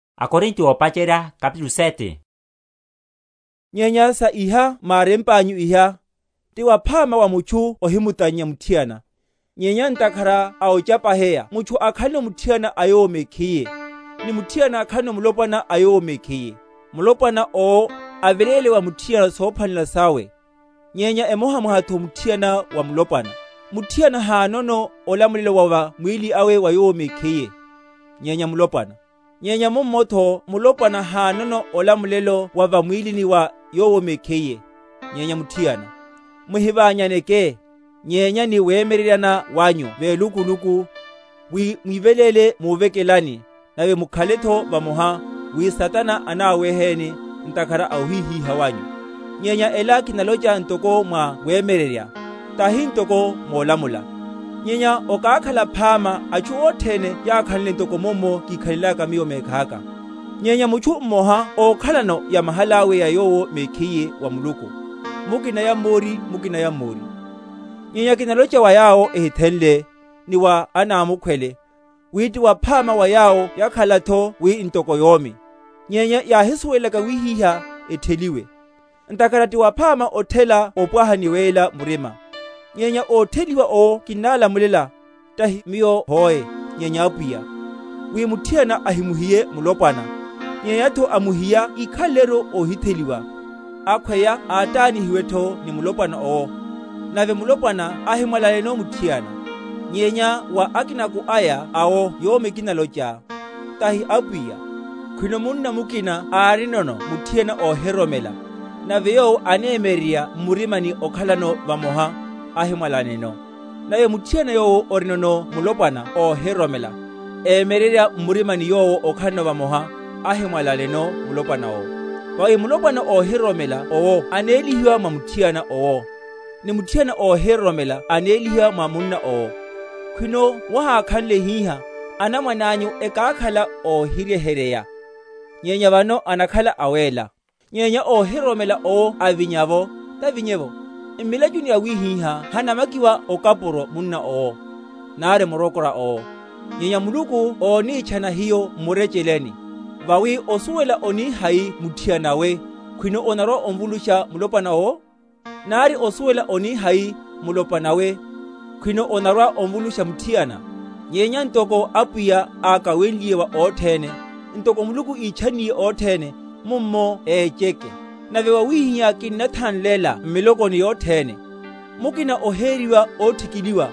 Masu a othela. Nyenya sa iha mwárempanyu iha; ti waphama wa mutchu ohimutannya muthiana. Nyenya ntakhara a ochapaheya mutchu akhaleno muthiana a yowo mekhiye, ni muthiana akhaleno mulopwana a yowo mekhiye. Mulopwana owo aveléle wa muthiana sophwanelela sawe; nyenya emohamohatho muthiana wa mulopwana. Muthiana hanono olamulelo wa va mwílini awe wa yowo mekhiye, nyenya mulopwana: nyenya mummotho mulopwana hanono olamulelo wa va mwílini wa yowo mekhiye, nyenya muthiana. Muhiványaneke, nyenya ni wemyeryeryana wanyu welukuluku, wi mwiveléle múvekelani, nave mukhaletho vamoha, wi Satana anáwéheni, ntakhara a ohíhíha wanyu. Nyenya ela kinalocha ntoko mwa wemyeryerya, tahi ntoko molamula. Nyenya okákhala phama atchu othene yákhanle ntoko mummo kikhalelaka miyo mekhaka. Nyenya mutchu mmoha ókhalano yamahalawe ya yowo mekhiye wa Muluku, mukina yammori, mukina yammori. Nyenya kinalocha wa yawo ehithenle, ni wa anámukhwele, wi ti waphama wa yawo yakhalatho wi ntoko yomi. Nyenya yáhisuwelaka wíhíha, ethelihiwe; ntakhara ti waphama othela opwaha ni weyela murima. Nyenya ótheliwa’wo kinnálamulela, tahi miyo hoe, nyenya Apwiya, wi muthiana ahimuhiye mulopwana, nyenyatho amuhiya íkhaleleru óhitheliwa, akhweya átánihiwetho ni mulopwana owo, nave mulopwana ahimwalaneno muthiana. Nyenya wa akinaku aya awo yomi kinalocha, tahi Apwiya, Khwino munna mukina árinono muthiana óhiroromela, nave yowo anemyeryerya m’murima okhalano vamoha, ahimwalaneno. Nave muthiana yowo orinono mulopwana óhiroromela, emyeryerya m’murima yowo okhalano vamoha, ahimwalaneno mulopwana owo. Vawi mulopwana óhiroromela owo anélihiwa mwa muthiana owo, ni muthiana óhiroromela anélihiwa mwa munna owo; khwino wahákhanle hihá, anamwanányu ekákhala óhiryeheryeya, nyenya vano enakhala awéla. Nyenya óhiroromela owo avinya’vo, tavinye’vo. M’milachu yawihiha hanamakiwa okapuro munna owo, nari murokora owo. Nyenya Muluku ónítchana hiyo m’murecheleni. Vawi osuwela oni hai muthiana we, khwino onarwa‐ovulusha mulopwana owo? nari osuwela oni hai, mulopwana we, khwino onarwa‐ovulusha muthiana? Nyenya, ntoko Apwiya, akawenliye wa othene, ntoko Muluku ítchanniye othene, mummo écheke. Nave wawihihá kinnathanlela m’milokoni yothene. Mukina oheriwa óthikiliwa?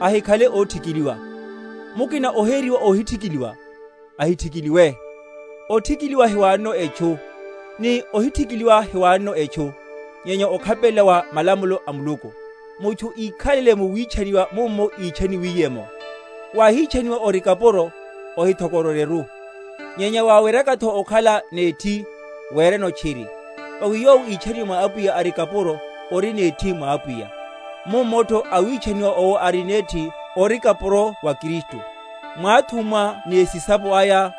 Ahikhale óthikiliwa. Mukina oheriwa óhithikiliwa? Ahithikiliwe. Othikiliwa hiwanono etchu, ni ohithikiliwa hiwanono etchu, nyenya okhapelela wa malamulo a Muluku. Mutchu íkhalele mu witchaniwa mummo ítchaniwiye’mo. Wáhitchaniwa ori kapuro? Ohithokororyeru: nyenya waweryakatho okhala nethi, wereno tchiri. Vawi yowo ítchaniwe mwa Apwiya, ari kapuro, ori nethi mwa Apwiya: mummotho awitchaniwa owo, ari nethi, ori kapuro wa Kristu. Mwáthummwa ni esisapo aya;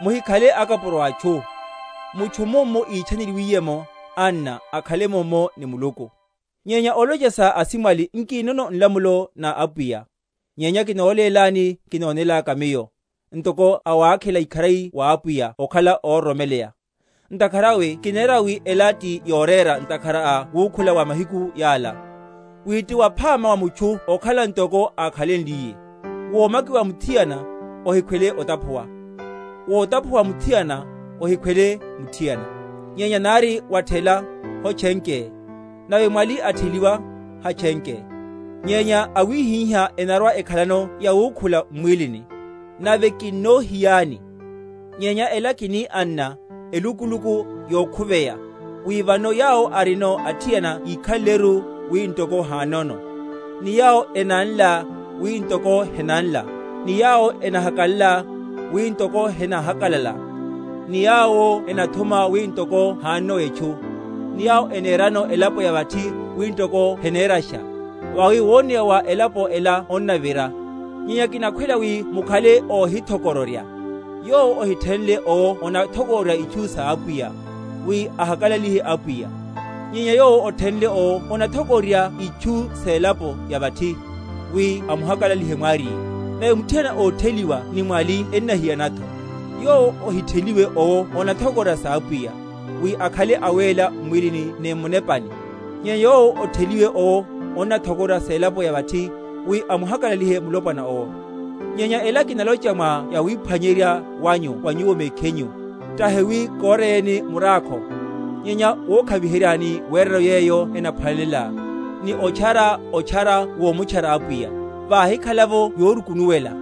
muhikhale akapuro a atchu. Mutchu, mummo ítchaneliwiye’mo, anna, akhale mummo ni Muluku. Nyenya olocha sa asimwali, nkinono nlamulo na Apwiya; nyenya kinólélani kinonelaka miyo, ntoko awákhela ikharari wa Apwiya okhala óroromeleya. Ntakhara awe kinera wi ela ti yorera ntakhara a wukhula wa mahiku yala, wi ti waphama wa mutchu okhala ntoko akhaleliye. Womakiwa wa muthiana? Ohikhwele otaphuwa. Wotaphuwa wa muthiana? Ohikhwele muthiana. Nyenya nari wathela, hotchenke; nave mwali atheliwa, hatchenke. Nyenya awihiha enarwa‐ekhalano yawukhula m’mwílini, nave kinnohiyani. Nyenya ela kini, anna, elukuluku yokhuveya, wi vano yawo arinono athiana yikhaleleru wi ntoko hanono; ni yawo enanla, wi ntoko henanla, ni yawo enahakalala, wi ntoko henahakalala; ni yawo enathuma wi ntoko hanono etchu; ni yawo enerano elapo ya vathi, wi ntoko henerasha; vawi woneya wa elapo ela onnavira. Nyenya kinakhwela wi mukhale óhithokororya. Yowo ohithenle owo onathokororya itchu sa Apwiya, wi ahakalalihe Apwiya; nyenya yowo othenle owo onathokororya itchu selapo ya vathi, wi amuhakalalihe mwariye. Nave muthiana ótheliwa ni mwali ennahiyanatho. Yowo ohitheliwe owo onathokororya sa Apwiya, wi akhale awéla m’mwílini ni m munepani; nyenya yowo ótheliwe owo, onathokororya selapo ya vathi, wi amuhakalalihe mulopwana owo. Nyenya ela kinalocha mwa yawiphwanyerya wanyu wa nyuwo mekhinyu; tahi wi koreyeni murákho, nyenya wokhaviheryani werano yeyo enaphwanelela, ni otchara otchara womutchara Apwiya, vahikhala’vo yorukunuwela.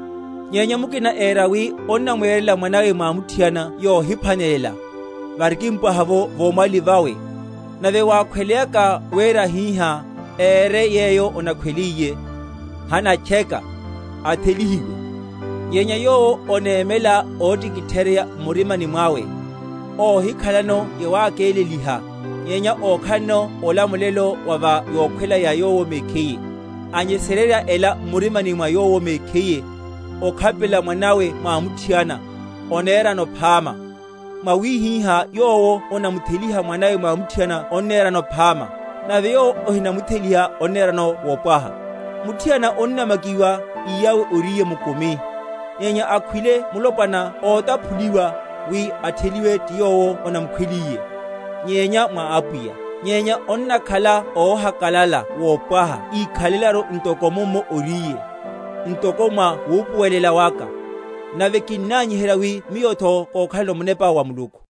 Nyenya mukina éra wi onnamwerela mwanawe mwamuthiana yohimphwanelela, varikimpwaha’vo vomwali vawe, nave wakhweleyaka wera hihá, ére yeyo onakhweliye, hanatcheka; athelihiwe. Nyenya yowo onémela óthikitheryeya m’murimani mwawe, óhikhalano yawákeleliha, nyenya ókhalano olamulelo wa va yokhwela ya yowo mekhiye, anyesererya ela m’murimani mwa yowo mekhiye, okhapelela mwanawe mwamuthiana, onerano phama. Mwawihihá yowo onamutheliha mwanawe mwamuthiana onnerano phama, nave yowo ohinamutheliha onnerano mopwaha. Muthiana onnamakiwa iyawe oríye mukumi, nyenya akhwile mulopwana ótaphuliwa, wi atheliwe ti yowo onamukhweliye, nyenya mwa Apwiya. Nyenya onnakhala óhakalala wopwaha íkhalelaru ntoko mummo oríye, ntoko mwa wupuwelela waka; nave kinnanyiherya wi miyotho kokhalano Munepa wa Muluku.